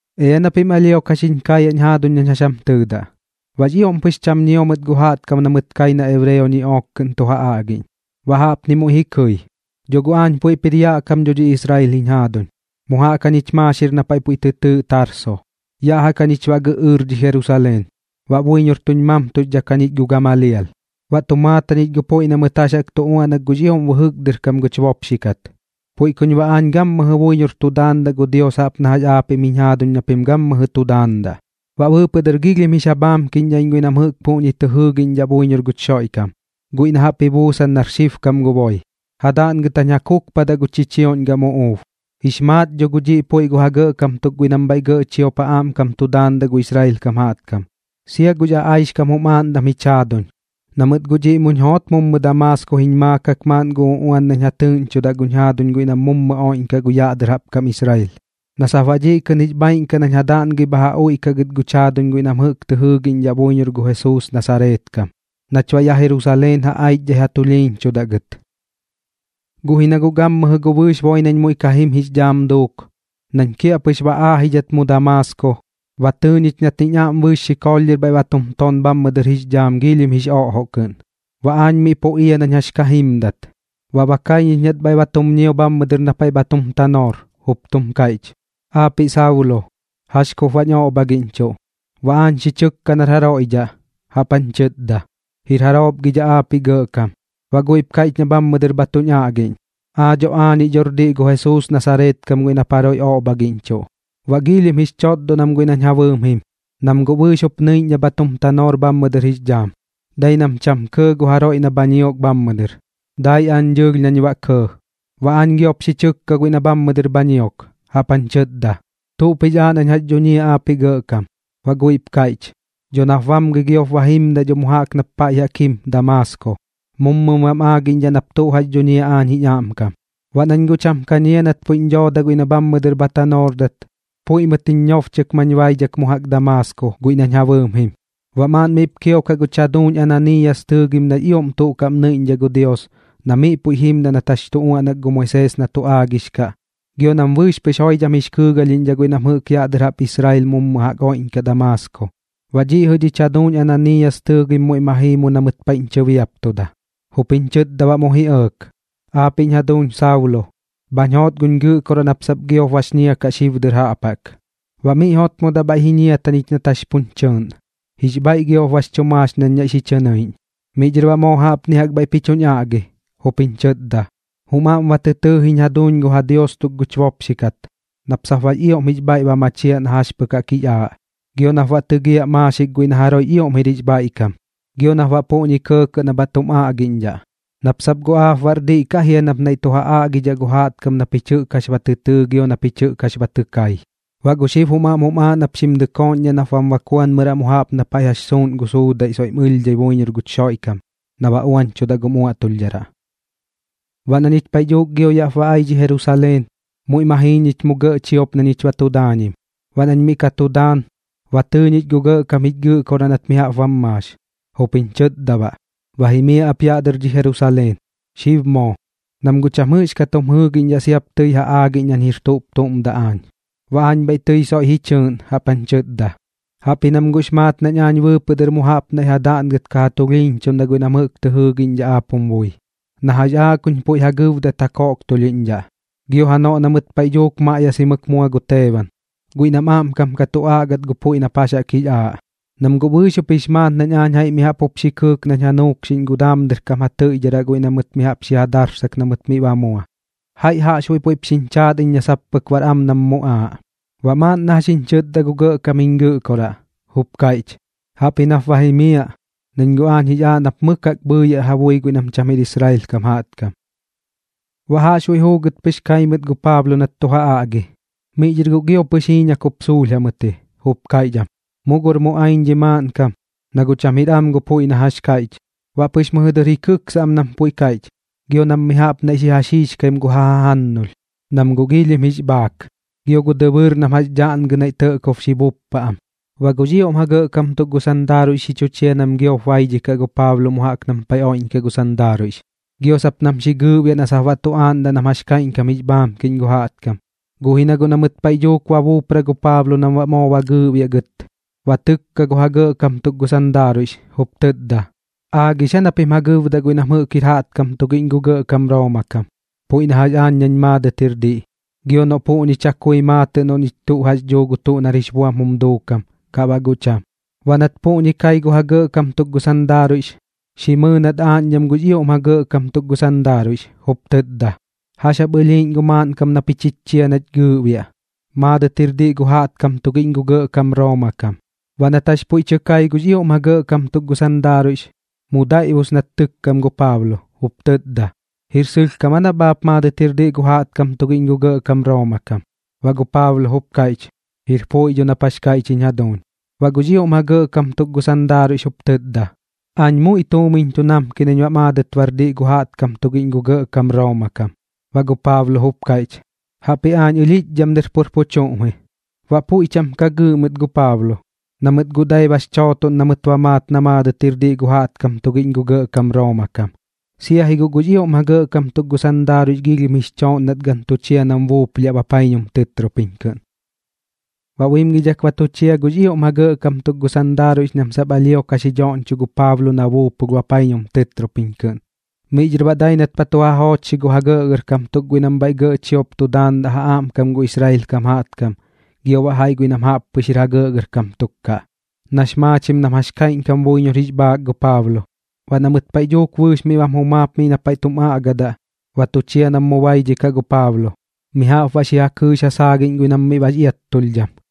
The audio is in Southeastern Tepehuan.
―Ea na pim alhio ka xiñ kaayaꞌñ jaaduñ nañ jax jam tɨɨdaꞌ. Baꞌx ioꞌm pɨx cham ñio mɨt gu jaꞌtkam na mɨt kai na ebreo ñiꞌook kɨꞌn tu ja aꞌgiꞌñ. Baꞌ jaꞌpni muiꞌ ji kɨi: ―Dho guꞌ aañ puiꞌp jir yaꞌ kam dho dhi Israel jiñ jaaduñ, mu jaꞌk jañich maaxir na paiꞌ puiꞌ tɨ tɨɨꞌ Tarso, yaꞌ jaꞌk jañich baꞌ gɨꞌɨɨr dhi Jerusaleen. Baꞌ buiñor tuñ mamtuxdhak jañich gu Gamalial, baꞌ tu maat jañich gu puiꞌ na mɨt jax jaꞌk tu uaꞌnak gux ioꞌm bɨjɨk dɨr kam guch bopxi kat. Puiꞌ kuñ baꞌ aañ gammɨjɨ buiñor tu daandaꞌ gu Dios jaꞌp na jax aapiꞌm jiñ jaaduñ na pim gammɨjɨ tu daandaꞌ. Baꞌ bɨɨpɨꞌ dɨr giilhim jix ja bhaamkiꞌñdhaꞌ iñ guiꞌ nam jɨꞌk puꞌñi tɨ jɨɨgiꞌñdhaꞌ buiñor guch Xoiꞌkam, guiꞌ na jaꞌp ji buusan nar xibkam gu boi, ja daꞌngɨt jañ ja kukpadaꞌ gu chichioꞌñ gam uꞌuub. Jix maat dho gu dhiꞌ puiꞌ gu ja gɇꞌkam tuk guiꞌ nam bhaiꞌ gɇꞌ chiop ja aꞌmkam tu daandaꞌ gu Israel kam jaꞌtkam, sia gux aꞌaixkam jum aaꞌndam jich jaaduñ, na mɨt guꞌ dhiꞌ muñ joot mu Damaasko jiñ maakak maaꞌn gu uꞌuan nañ ja tɨɨꞌñchudaꞌ guch jaaduñ guiꞌ nam mummɨ oiꞌñkaꞌ gu yaꞌ dɨr jaꞌp kam Israel, na sap baꞌ dhiꞌ kɨꞌn jix bhaaiꞌn kaꞌ nañ ja daꞌngɨi bha ja uiꞌkaꞌ gɨt guch jaaduñ guiꞌ nam jɨꞌk tɨ jɨɨgiꞌñdhaꞌ buiñor gu Jesuus Nasareet kam, nach baꞌ yaꞌ Jerusaleen ja aichdhai ja tulhiiñchudaꞌ gɨt. ’Guꞌ ji na guꞌ gammɨjɨ gu bɨɨx boi nañ muiꞌ ka jim jix dhaam duuk, nañ kiaꞌpɨx ba aajidhat mu Damaasko, ba tɨɨ ñich nat jiñ aꞌm bɨɨx xikoolh bhaiꞌ ba tum ton bhammɨ dɨr jix dhaam giilhim jix oꞌjoꞌ kɨꞌn. Baꞌ aañ miꞌ pu ia nañ jax ka jimdat, baꞌ ba kai ñich nat bhaiꞌ ba tum ñio bhammɨ dɨr na paiꞌ bha tum tanoor, jup tum kaiꞌch: “Aapiꞌ Saulo, ¿jax kup baꞌñ oꞌbhagiꞌñchuꞌ?” Baꞌ aañ xi chɨkka nar jaroiꞌ dhaꞌ, jaꞌp jañ chɨtda: “¿Jir jaroop gi dhaꞌ aapiꞌ Gɇꞌkam?” Baꞌ guiꞌp kaiꞌch na bhammɨ dɨr bha tuñ aꞌgiꞌñ: “Aa dho aañiꞌ dhor diꞌ gu Jesuus Nasareet kam guiꞌ nap jaroiꞌ oꞌbhagiꞌñchuꞌ.” Baꞌ giilhim jix chotdon am guiꞌ nañ ja bɨɨm jim, nam guꞌ bɨɨx jup nɨiꞌñ na bha tum tanoor bhammɨ dɨr jix dhaam, dai nam cham kɇɇ gu jaroiꞌ na bha ñiok bhammɨ dɨr. Dai aañ dɨɨlh nañ baꞌ kɇɇ. Baꞌ aañ giop xi chɨkka guiꞌ na bhammɨ dɨr bha ñiok, jaꞌp jañ chɨtda: “¿Tuꞌp jix aaꞌ nañ jax dhuñiaꞌ aapiꞌ Gɇꞌkam?” Baꞌ guiꞌp kaiꞌch: “Dho nap bamgɨi giop ba jimdaꞌ dho mu jaꞌk nap paiꞌ jaꞌk jim Damaasko. Mummɨm baꞌm aagiꞌñdhaꞌ nap tuꞌ jax dhuñiaꞌ aañ jiñ aꞌmkam.” Baꞌ nañ guꞌ cham ka ñia nat puiꞌñ dhooda guiꞌ na bhammɨ dɨr bha tanoordat, puiꞌ mɨt jiñ ñobchɨk mañ baidhak mu jaꞌk Damaasko guiꞌ nañ ja bɨɨm jim. ’Baꞌ maaꞌn miꞌp kiokaꞌ guch jaduuñ Ananiiyas tɨɨgim nax ioꞌm tuꞌ kaꞌm nɨiꞌñdhaꞌ gu Dios na miꞌ puiꞌ jimdaꞌ nat jax jaꞌk tu uaꞌnak gu Moisees na tu aagix kaꞌ, gio nam bɨɨx pɨx joidham jix kɨɨgalhiꞌñdhaꞌ guiꞌ nam jɨꞌk yaꞌ dɨr jaꞌp Israel mummɨ jaꞌk oiꞌñkaꞌ Damaasko. Baꞌ dhiꞌ jɨꞌ dhich jaduuñ Ananiiyas tɨɨgim muiꞌ ma jii mu na mɨt paiꞌñ chɨbiaptuda, jup jiñ chɨtda baꞌ mu ji ɇɇk: “Aapiꞌñ jaduuñ Saulo, bhañ joot guch Gɨꞌkoraꞌ nap sap giop bax ñia kaꞌ xib dɨr jaꞌp jaꞌk.” Baꞌ miꞌ jotmodaꞌ bhaiꞌ ji ñiata ñich nat jax puñ chɨɨꞌn. Jix bhaiꞌ giop bax chu maax nañ naiꞌ xi chɨ nɨiꞌñ. Miꞌ dhɨr baꞌ moo jaꞌpni jaꞌk bhaiꞌp ji chuñ aꞌgi, jup jiñ chɨtda: “Jum aꞌm ba tɨ tɨɨ jiñ jaduuñ gu ja Dios tuk guch bopxi kat nap sap baꞌx ioꞌm jix bhaiꞌ ba machiaꞌ na jax pɨk jaꞌk jix aaꞌ, gio nap baꞌ tɨgiaꞌ maaxik guiꞌ na jaroiꞌx ioꞌm jir jix bhaiꞌkam, gio nap baꞌ puꞌñi kɇɇkɇꞌ na bha tum aꞌgiꞌñdhaꞌ, nap sap guꞌ aap baꞌr diꞌ kaꞌ jia nap naiꞌ tu ja aꞌgidhaꞌ gu jaꞌtkam na pich jɨꞌk jax ba tɨ tɨɨ gio na pich jax jaꞌk ba tɨ kai. Baꞌ gu xib jum aaꞌ nap xim dɨkooꞌñdhaꞌ nap bam bakuanmɨraꞌ mu jaꞌp paiꞌ na jax suuꞌnkaꞌ gu suudaiꞌ soiꞌm ɨlhdhat buiñor guch Xoiꞌkam na baꞌ uañchudaꞌ gum uaꞌtulhdharaꞌ.” ’Baꞌ na ñich paiꞌ dhuuk gio yaꞌp ba ai dhi Jerusaleen, muiꞌ ma jii ñich mu gɇꞌ chiop na ñich ba tu daañim. Baꞌ nañ miꞌ ka tu daan, ba tɨɨ ñich gu Gɇꞌkam jich Gɨꞌkoraꞌ nat mi jaꞌp bam maax, jup jiñ chɨtda baꞌ: “Ba jimiaꞌ ap yaꞌ dɨr dhi Jerusaleen, xib moo, nam guꞌ cham jɨꞌxkat jum jɨɨgiꞌñdhaꞌ sia kup tɨi ja aagiꞌñ nañ jir tuꞌp tuꞌm daꞌ aañ.” Baꞌ aañ bhaiꞌ tɨi soiꞌ ji chɨɨꞌn jaꞌp jañ chɨtda: “Jaꞌpji nam guꞌx maat nañ aañ bɨɨpɨꞌ dɨr mu jaꞌp naiꞌ ja daꞌngɨt ka ja tulhiiñchuꞌndaꞌ guiꞌ nam jɨꞌk tɨ jɨɨgiꞌñdhaꞌ aap jum bui, na jax aaꞌ kuñ puiꞌ ja gɨbdat ja koꞌktulhiꞌñdhaꞌ. Gio janoꞌ na mɨt paiꞌ dhuuk maꞌyasimɨk mua gu Teeban, guiꞌ nam aꞌmkam ka tu aꞌgat gu puiꞌ nap jax jaꞌk jix aaꞌ, nam guꞌ bɨɨx jup jix maat nañ aañ jaiꞌ mi jaꞌp jup xi kɨɨk nañ ja nuukxiꞌñ gu daam dɨr kam ja tɨiꞌdharaꞌ guiꞌ na mɨt mi jaꞌp xi ja darsak na mɨt miꞌ ba ji mua. Jaiꞌ jaꞌxbuiꞌ puiꞌp xiñ chaat iñ na sap pɨk baꞌr am nam muꞌaaꞌ.” Baꞌ maaꞌn na jax jiñ chɨtda gu Gɇꞌkam jich Gɨꞌkoraꞌ, jup kaiꞌch: “Jaꞌpji nap ba jimiaꞌ, nañ guꞌ aañ jix aaꞌ nap mɨk jaꞌk bhɨɨyaꞌ ja bui guiꞌ nam cham jir Israel kam jaꞌtkam.” Baꞌ jaꞌxbuiꞌ juugɨt pɨx kai mɨt gu Paablo nat tu ja aꞌgi, miꞌ dhɨr guꞌ gio pɨx jiiñak jup suulh jamɨt ji, jup kaiꞌch am: ―¡Mu gor muꞌaiñ dhi maaꞌnkam, na guꞌ cham jir am gu puiꞌ na jax kaiꞌch! Baꞌ pɨx mɨjɨ dɨr ji kɨksa am nam puiꞌ kaiꞌch, gio nam mi jaꞌp naiꞌ xi ja xiixkaim gu ja jajannulh, nam guꞌ giilhim jix bhaak, gio gu dɨbɨɨr nam jax daꞌngɨ naiꞌ tɇꞌkob xi buppa am. Baꞌ gux ioꞌm ja gɇꞌkam tuk gu sandaaruiꞌx xi chu chia nam giop baidhikaꞌ gu Paablo mu jaꞌk nam paiꞌ oiꞌñkaꞌ gu sandaaruiꞌx, gio sap nam xi gɨɨꞌbiaꞌ na sap baꞌ tu aagaꞌ nam jax kaiꞌñkam jix bhaamkiꞌñ gu jaꞌtkam. Guꞌ ji na guꞌ na mɨt paiꞌ dhuuk ba buupra gu Paablo nam baꞌ moo ba gɨɨꞌbiaꞌ gɨt, ba tɨkka gu ja gɇꞌkam tuk gu sandaaruiꞌx, jup tɨtda: ―¿Aagix aa na pim ja gɨbdaꞌ guiꞌ nam jɨꞌk jir jaꞌtkam tugiꞌñ gu gɇꞌkam Rooma kam, puiꞌ na jax aañ nañ maadɨt jir diꞌ, gio noꞌ puꞌñi chakui maatɨꞌ noꞌ ñich tuꞌ jax dhuu gu tuꞌ nar jix buam jum duukam kaꞌ baꞌ guꞌ cham? Baꞌ nat puꞌñi kai gu ja gɇꞌkam tuk gu sandaaruiꞌx, xi mɨɨ nat aaꞌñdham gux ioꞌm ja gɇꞌkam tuk gu sandaaruiꞌx, jup tɨtda: ―¿Jax jap baꞌ ɨlhiiꞌñ gu maaꞌnkam na pich jich chia nach gɨɨꞌbiaꞌ? Maadɨt jir diꞌ gu jaꞌtkam tugiꞌñ gu gɇꞌkam Rooma kam. Baꞌ nat jax puiꞌ tɨ kai gux ioꞌm ja gɇꞌkam tuk gu sandaaruiꞌx, mu daiꞌbus nat tɨkkam gu Paablo, jup tɨtda: ―¿Jir sɨlhkam aa nap aap maadɨt jir diꞌ gu jaꞌtkam tugiꞌñ gu gɇꞌkam Rooma kam? Baꞌ gu Paablo jup kaiꞌch: ―Jir puiꞌ dho nap jax kaiꞌch jiñ jaduuñ. Baꞌ gux ioꞌm ja gɇꞌkam tuk gu sandaaruiꞌx jup tɨtda: ―Aañ muiꞌ tuumiñ tu namki nañ baꞌ maadɨt bar diꞌ gu jaꞌtkam tugiꞌñ gu gɇꞌkam Rooma kam. Baꞌ gu Paablo jup kaiꞌch: ―Jaꞌpji aañ ɨlhiꞌchdham dɨr pur pu chuꞌm ji. Baꞌ puiꞌ cham ka gɨɨꞌ mɨt gu Paablo, na mɨt guꞌ dai bax chootoꞌn na mɨt ba maat na maadɨt jir diꞌ gu jaꞌtkam tugiꞌñ gu gɇꞌkam Rooma kam, sia ji guꞌ gux ioꞌm ja gɇꞌkam tuk gu sandaaruiꞌx giilhim jix chooꞌn nat gan tu chia nam buuplhiaꞌ bapaiñum tɨtropiñ kɨꞌn. Baꞌ buimgidhak ba tu chia gux ioꞌm ja gɇꞌkam tuk gu sandaaruiꞌx nam sap alhio ka xi dhoꞌñchoꞌ gu Paablo na buupulh bapaiñum tɨtropiñ kɨꞌn. Miꞌ dhɨr baꞌ dai nat ba tu ja joochxi gu ja gɇꞌgɇrkam tuk guiꞌ nam bhaiꞌ gɇꞌ chiop tu daandaꞌ ja aꞌmkam gu Israel kam jaꞌtkam gio baꞌ jaiꞌ guiꞌ nam jaꞌppɨx jir ja gɇꞌgɇrkam tuk kaꞌ, nax maachim nam jax kaiꞌñkam buiñor jix bhaak gu Paablo. Baꞌ na mɨt paiꞌ dhuuk bɨɨx miꞌ bam jumaap miꞌ na paiꞌ tum aꞌgadaꞌ, ba tu chia nam mu baidhikaꞌ gu Paablo, mi jaꞌp baꞌ xi ja kɨɨx ja saagiꞌñ guiꞌ nam miꞌ bax iattulhdham.